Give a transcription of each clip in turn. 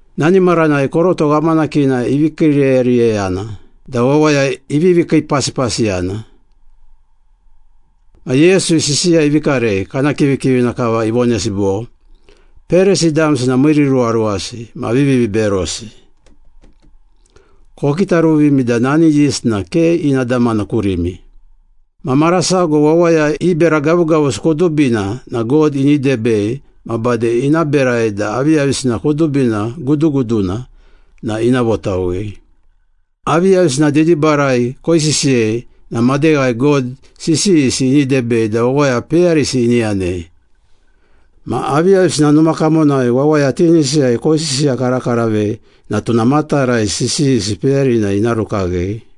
Nani maranai koroto ghamanakina ivi kiiriyeriyeyana da wawaya ivivi kiipasipasiyana. Ma Yesu sisiya ivi karei, kana kivikivina kava ivonesi bo, “Perisi damsi na miiriruwaruwasi ma viviberosi. Kokitaruvimi da nani yist na ke ina damana kurimi. Ma mara sago wawaya i bera gavugavusi kudubina na God ini debei ma bade ina berai da aviyavisina kudubina guduguduna na ina votawei. Aviyavisina didibarai koisisiyei na madeghai God sisiyisi ini debei da wawaya peyarisi ini yanei. Ma aviyavisina numa kamonai wawaya tinisiyai koisisiyakarakaravei na tuna matarai sisiyisi peyarina ina rukaghei.”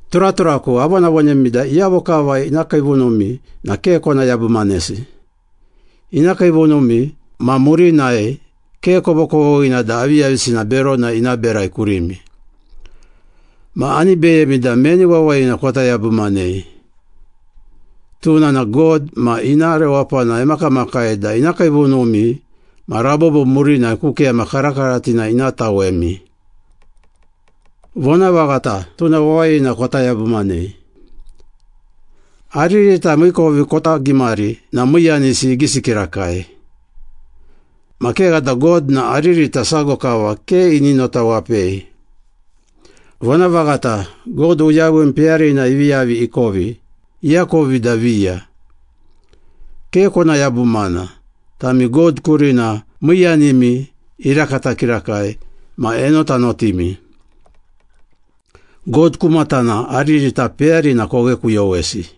“Turaturaku, avonavonemi da iyavo kava ina kiivunumi na ke kona yabumanesi. Ina kiivunumi ma murinai ke kovokovoghina da aviyavisina berona ina berai kurimi. Ma ani beyemi da meni wawayina kota yabumanei. Tuna na God ma ina rewapana emakamakai da ina kiivunumi ma rabobo murinai ku keyama karakaratina ina tawemi. Vonavaghata, tuna wawayina kota yabumanei.” “Aririta miikovi kota gimari na miiyanisi igisi kirakai. Ma kegha da God na aririta sago kava ke ini notawapei. Vonavaghata, God uyawim peyarina ivi yavi ikovi, iakovi da viya. Ke kona yabumana, tami God kurina miiyanimi irakata kirakai ma enotanotimi. God ku matana aririta peyarina koghekuyowesi.”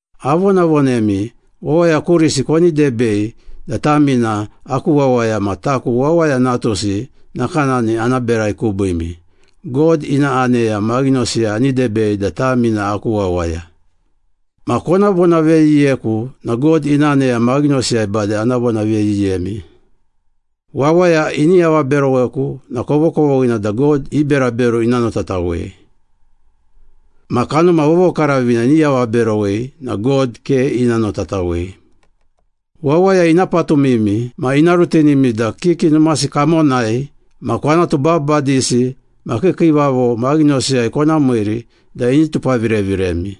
“Avonavonemi, wawaya kurisi koni debei da tami na aku wawaya ma taku Wawaya Natusi nakanani ana berai kubiimi, God ina aneya maghinosiyai ani debei da tami na aku wawaya. Ma kona vonaveyiyeku na God ina aneya maghinosiyai bade ana vonaveyiyemi.” “Wawaya ini avaberoweku na kovokovoghina da God i berabero ina notatawei. Ma Kanuma Vovokaravina ini avaberowei na God ke ina notatawei.” “Wawaya ina patumimi ma ina rutinimi da kiki numasi kamonai ma kwanatu babadisi ma kiikiivavo maghinosiyai kona miiri da ini tupavireviremi.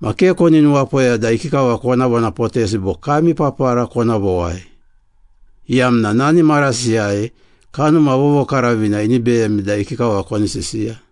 Ma ke koni nuwapoya da ikikava kona vonapotesi bo kami papara kona vowai, iyamna nani marasiyai Kanuma Vovokaravina ini beyemi da ikikava koni sisiya.”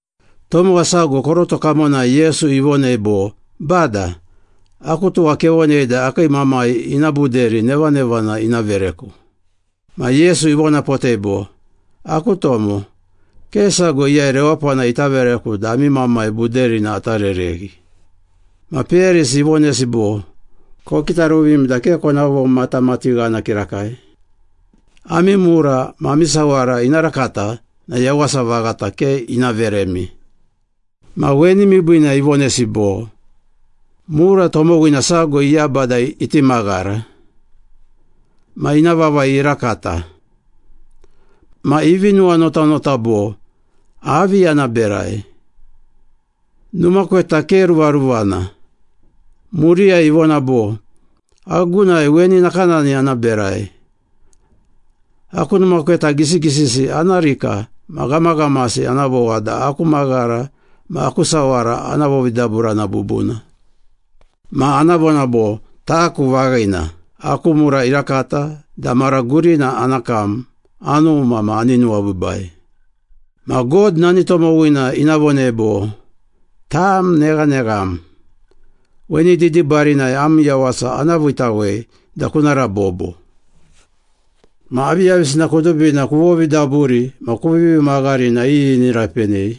Tomowa sago koroto kamonai Yesu ivonei bo, “Bada, aku tuwa kevonei da akii mamai ina buderi nevanevana ina vereku.” Ma Yesu ivonapotei bo, “Aku tomo, ke sago iyai rewapana ita vereku da ami mamai buderina ata rereghi.” Ma peyarisi ivonesi bo, “Kokitaruvimi da ke kona vomatamatighana kirakai. Ami mura ma ami sawara ina rakata na yawasa vaghata ke ina veremi.” Ma weni miibiina ivonesi bo, “Mura tomowina sago iyaba da iti maghara ma ina vavai irakata. Ma ivi nuwanotanota bo, ‘Avi ana berai? Numa kweta ke ruvaruvana.’ Muriyai ivona bo, ‘Agunai weni nakanani ana berai. Aku numa kweta gisigisisi ana rika ma ghamaghamasi ana vowa da aku maghara ma aku sawara ana vovidaburana bubuna. Ma ana vona bo, “Taku vaghina, aku mura irakata da mara gurina ana kam, anuma ma ani nuwabiibai.” ’ Ma God nani tomowina ina vonei bo, ‘Tam neghanegham. Weni didibarinai am yawasa ana viitawei da kuna rabobo. Ma aviyavisina kudubina kuvovidaburi ma kuvivi maghari na iyi ini rapenei?’”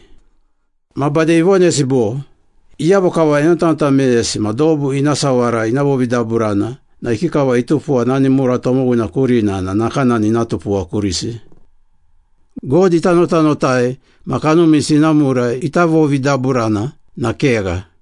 Ma bade ivonesi bo, “Iyavo kava enotanota meyesi ma dobu ina sawara ina vovidaburana na ikikava itupuwa nani mura tomowina kurina na nakanani ina tupuwa kurisi. God ita notanotai ma kanumisi ina mura ita vovidaburana na kegha.”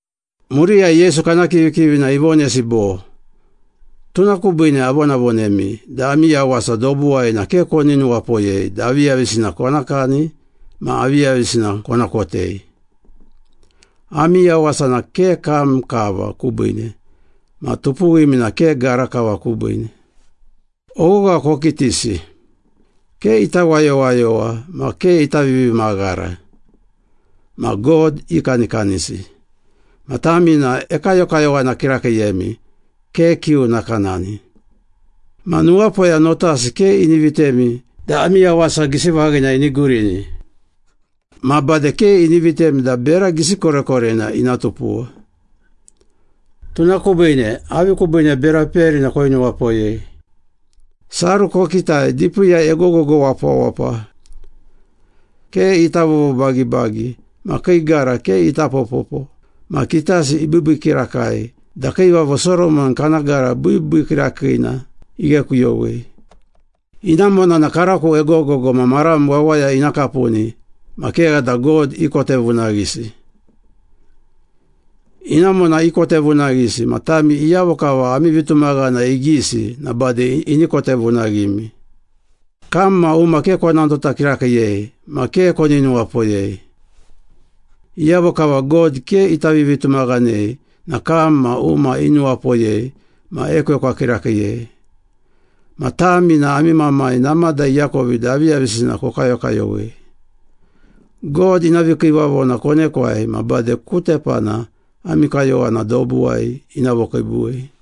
Muriyai Yesu kana kivikivina ivonesi bo, “Tuna kubiine avonavonemi da ami yawasa dobuwai na ke koni nuwapoyei da aviyavisina kona kani ma aviyavisina kona kotei. Ami yawasa na ke kam kava kubiine ma tupuwimi na ke gara kava kubiine. Oghogha kokitisi. Ke ita wayowayowa ma ke ita vivimaghara. Ma God ikanikanisi. Ma tami na ekayokayowana kirakiiyemi, ke kiu nakanani. Ma nuwapoya notasi ke ini vitemi da ami yawasa gisi vaghina ini gurini. Ma bade ke ini vitemi da bera gisi korekorena ina tupuwa. Tuna kubiine avi kubiine bera peyarina koinuwapoyei? Saru kokitai, dipiiyai egogogo wapawapa. Ke ita vovobagibagi ma kii gara ke ita popopo ma kitasi ibiibii kirakai da Kiivavo Soromon kana gara biibii kirakiina ighekuyowei. Inamona na karako egogogo ma maram wawaya ina kapuni ma kegha da God ikotevunaghisi. Inamona ikotevunaghisi ma tami iyavo kava ami vitumaghana igisi na bade ini kotevunaghimi.” “Kam ma uma ke kona nota kirakiiyei ma ke koni nuwapoyei. Iyavo kava God ke ita vivitumaghanei na kam ma uma inuwapoyei ma ekwekwa kirakiiyei. Ma tami na ami Mamai namada iakovi da aviyavisina kokayokayowei. God ina vikiivavona konekwai na bade ku tepana ami kayowana dobuwai ina vokiibuwei.”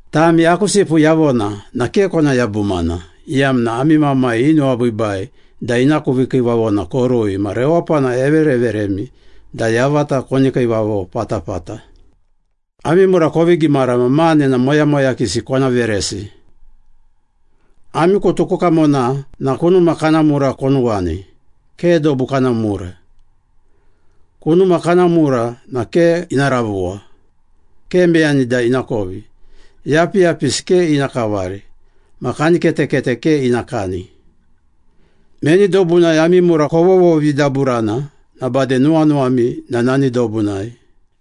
“Tami aku sipu yavona na ke kona yabumana, iyamna ami Mamai inuwabiibai da ina ku vikiivavona korui ma rewapana evereveremi da yavata koni kiivavo patapata. Ami mura kovi gimara ma mane na moyamoyakisi kona veresi. Ami kutu ku kamona na kunuma kana mura konuwani, ke dobu kana mura. Kunuma kana mura na ke ina ravuwa, ke meyani da ina kovi, yapiyapisi ke ina kavari, ma kaniketekete ke ina kani. Meni dobunai ami mura kovovovidaburana na bade nuwanuwami na nani dobunai.”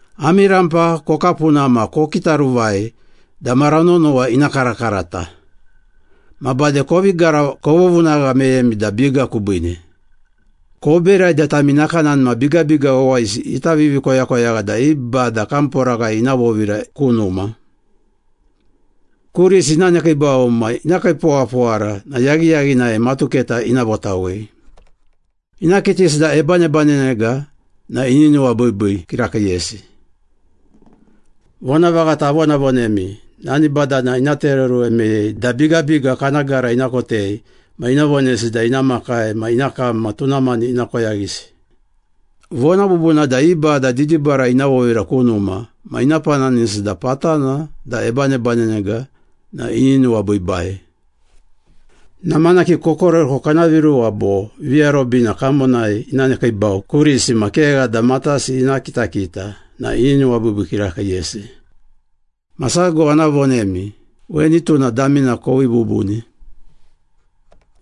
“Ami rampa kokapuna ma kokitaruvai da mara nonowa ina karakarata. Ma bade kovi gara, kovovunagha meyemi da biga kubiine. Koberai da tami nakanani ma bigabiga wawayisi ita vivikoyakoyagha da i bada kamporaghai ina vovira ku numa. Kurisi ina nekiibau ma ina kiipowapowara na yaghiyaghinai matuketa ina votawei. Ina kitisi da ebanebanenega na ini nuwabiibii kirakiiyesi. Vonavaghata avonavonemi, nani badana ina tereoruwe meyei da bigabiga kana gara ina kotei ma ina vonesi da ina makai ma ina kam ma tuna mani ina koyaghisi. Vona bubuna da i bada didibarai ina vovira ku numa ma ina pananisi da patana da ebanebanenega na ini nuwabiibai. Namanaki kokorereko kana viruwa bo viarobina kamonai ina nekiibau kurisi ma kegha da matasi ina kitakita na ini nuwabiibii kirakiiyesi. Ma sago ana vonemi, weni tuna damina kovii bubuni.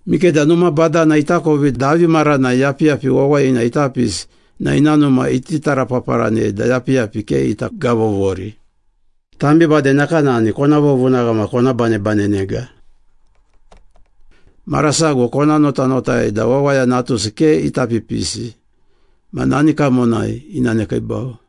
Mikeda numa badana itakovi da avi maranai yapiyapi wawayina ita pisi na ina numa iti tarapaparanei da yapiyapina ke ita gavovori. Tami bade nakanani kona vovunagha ma kona banebanenega. Mara sago kona notanotai da Wawaya Natusi ke ita pipisi ma nani kamonai ina nekiibau.”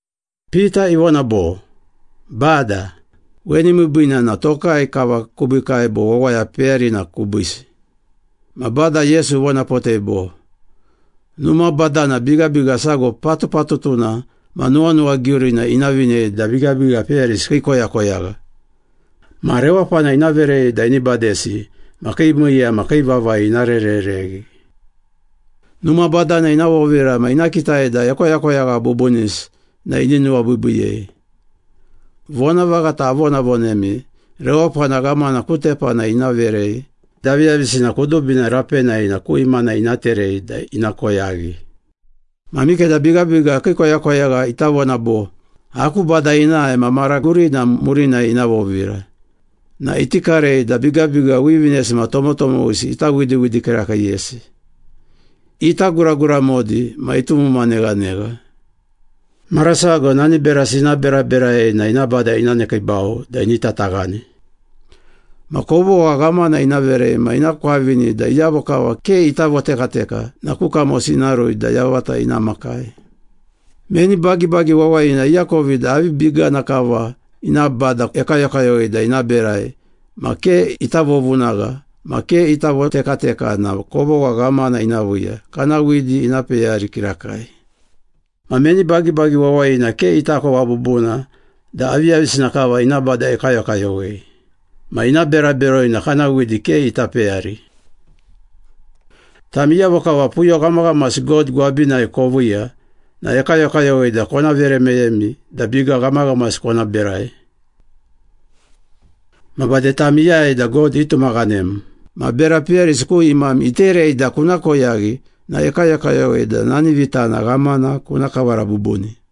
Pita ivona bo, “Bada, weni miibiina na tokai kava kubiikai bo wawaya peyarina kubiisi?” Ma Bada Yesu ivonapotei bo, “Numa badana bigabiga sago patupatutuna ma nuwanuwagiurina ina vinei da bigabiga peyarisi kii koyakoyagha. Ma rewapana ina verei da ini badesi ma kii miiya ma kii vavai ina rerereghi. Numa badana ina vovira ma ina kitai da ekoyakoyagha bubunisi na ini nuwabiibiiyei. Vonavaghata avonavonemi, rewapana ghamana ku tepana ina verei da aviyavisina kudubina rapenai na ku imana ina terei da ina koyaghi. Ma mikeda bigabiga kii koyakoyagha ita vona bo, ‘Aku bada inae ma mara gurina murinai ina vovira,’ na iti karei da bigabiga wivinesi ma tomotomowisi ita widiwidi kirakiiyesi, ita guraguramodi ma itumuma neghanegha. Mara sago nani berasi ina beraberai na ina bada ina nekiibau da ini tataghani. Ma kovogha ghamana ina verei ma ina kwavini da iyavo kava ke ita votekateka na ku kamosi ina rui da yavata ina makai.” “Meni bagibagi wawayina iakovi da avi bigana kava ina bada ekayokayowei da ina berai ma ke ita vovovunagha ma ke ita votekateka na kovogha ghamana ina viiya, kana widi ina peyari kirakai. Ma meni bagibagi wawayina ke itakova bubuna da aviyavisina kava ina bada ekayokayowei, ma ina bera beroi na kana widi ke ita peyari. Tami iyavo kava puyo ghamaghamasi God gwabinai koviiya na ekayokayowei da kona vere meyemi da biga ghamaghamasi kona berai. Ma bade tam iyai da God itumaghanem ma bera peyarisi ku imam iterei da kuna koyaghi na ekayokayowei da nani vitana ghamana kuna kavara bubuni.”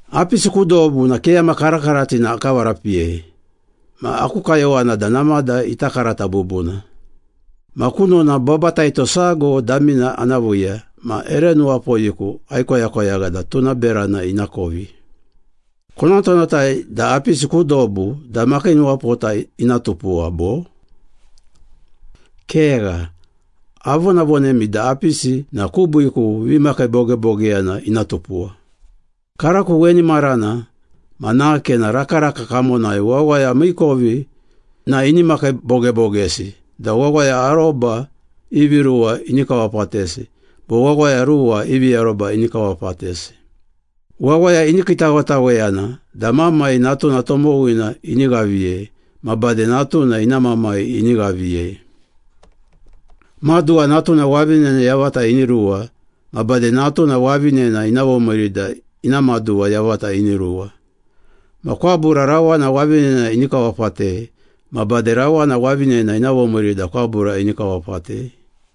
“Apisi ku dobu na keyama karakaratina akavarapiyei, ma aku kayowana da namada ita karata bubuna. Ma kunona babataito sago damina ana viiya ma ere nuwapoyiku aikoyakoyagha da tuna berana ina kovi. Konotanotai da apisi ku dobu da makiinuwapota ina tupuwa, bo? Kegha, avonavonemi da apisi na kubiiku vimakiibogebogeyana ina tupuwa. Karako weni marana ma nake na rakaraka kamonai wawaya miikovi na ini makiibogebogesi da wawaya aroba ivi ruwa ini kawapatesi bo wawaya ruwa ivi aroba ini kawapatesi. Wawaya ini kiitawetaweyana da mamai natuna tomowina ini ghaviyei ma bade natuna ina mamai ini ghaviyei. Maduwa natuna wavinena yavata ini ruwa ma bade natuna wavinena ina vomiiri da ina maduwa yavata ini ruwa. Ma kwabura rawana wavinena ini kawapatei, ma bade rawana wavinena ina vomiiri da kwabura ini kawapatei.”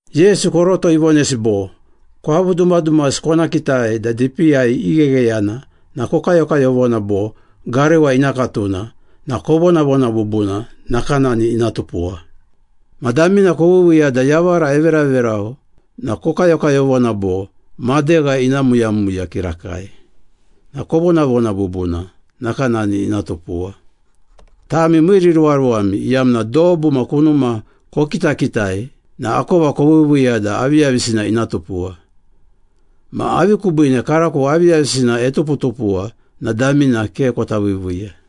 Yesu koroto ivonesi bo, “Kwavu dumadumasi kona kitai da dipiiyai ighegheyana na kokayokayovona bo, ‘Garewa ina katuna,’ na kovonavona bubuna, nakanani ina tupuwa. Ma damina koviiviiya da yavara everaverau na kokayokayovona bo, ‘Madegha ina muyamuya kirakai,’ na kovonavona bubuna, nakanani ina tupuwa. Tami miiriruwaruwami, iyamna dobu ma kunuma kokitakitai na akova koviiviiya da aviyavisina ina tupuwa. Ma avi kubiine karako aviyavisina etuputupuwa na damina ke kota viiviiya?”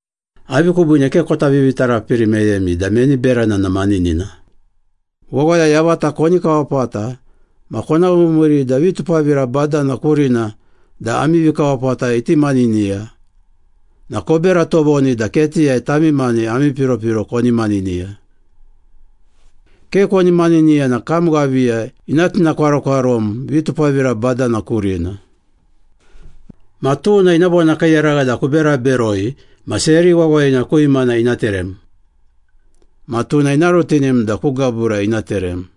“Avi kubiine ke kota vivitarapiri meyemi da meni berana na maninina? Wawaya yavata koni kawapata ma kona vomiiri da vitupavira badana kurina da ami vikawapata iti maniniya, na kobera tovoni da ketiyai tami mani ami piropiro koni maniniya. Ke koni maniniya na kam ghaviya ina tinakwarokwarom vitupavira badana kurina. Ma tuna ina vonakiiyaragha da kubera beroi ma seri wawayina ku imana ina terem. Ma tuna ina rutinim da ku gabura ina terem.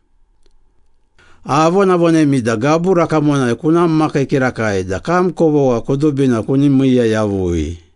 Avonavonemi da gabura kamonai kuna makii kirakai da kam kovogha kudubina kuni miiya yavui.”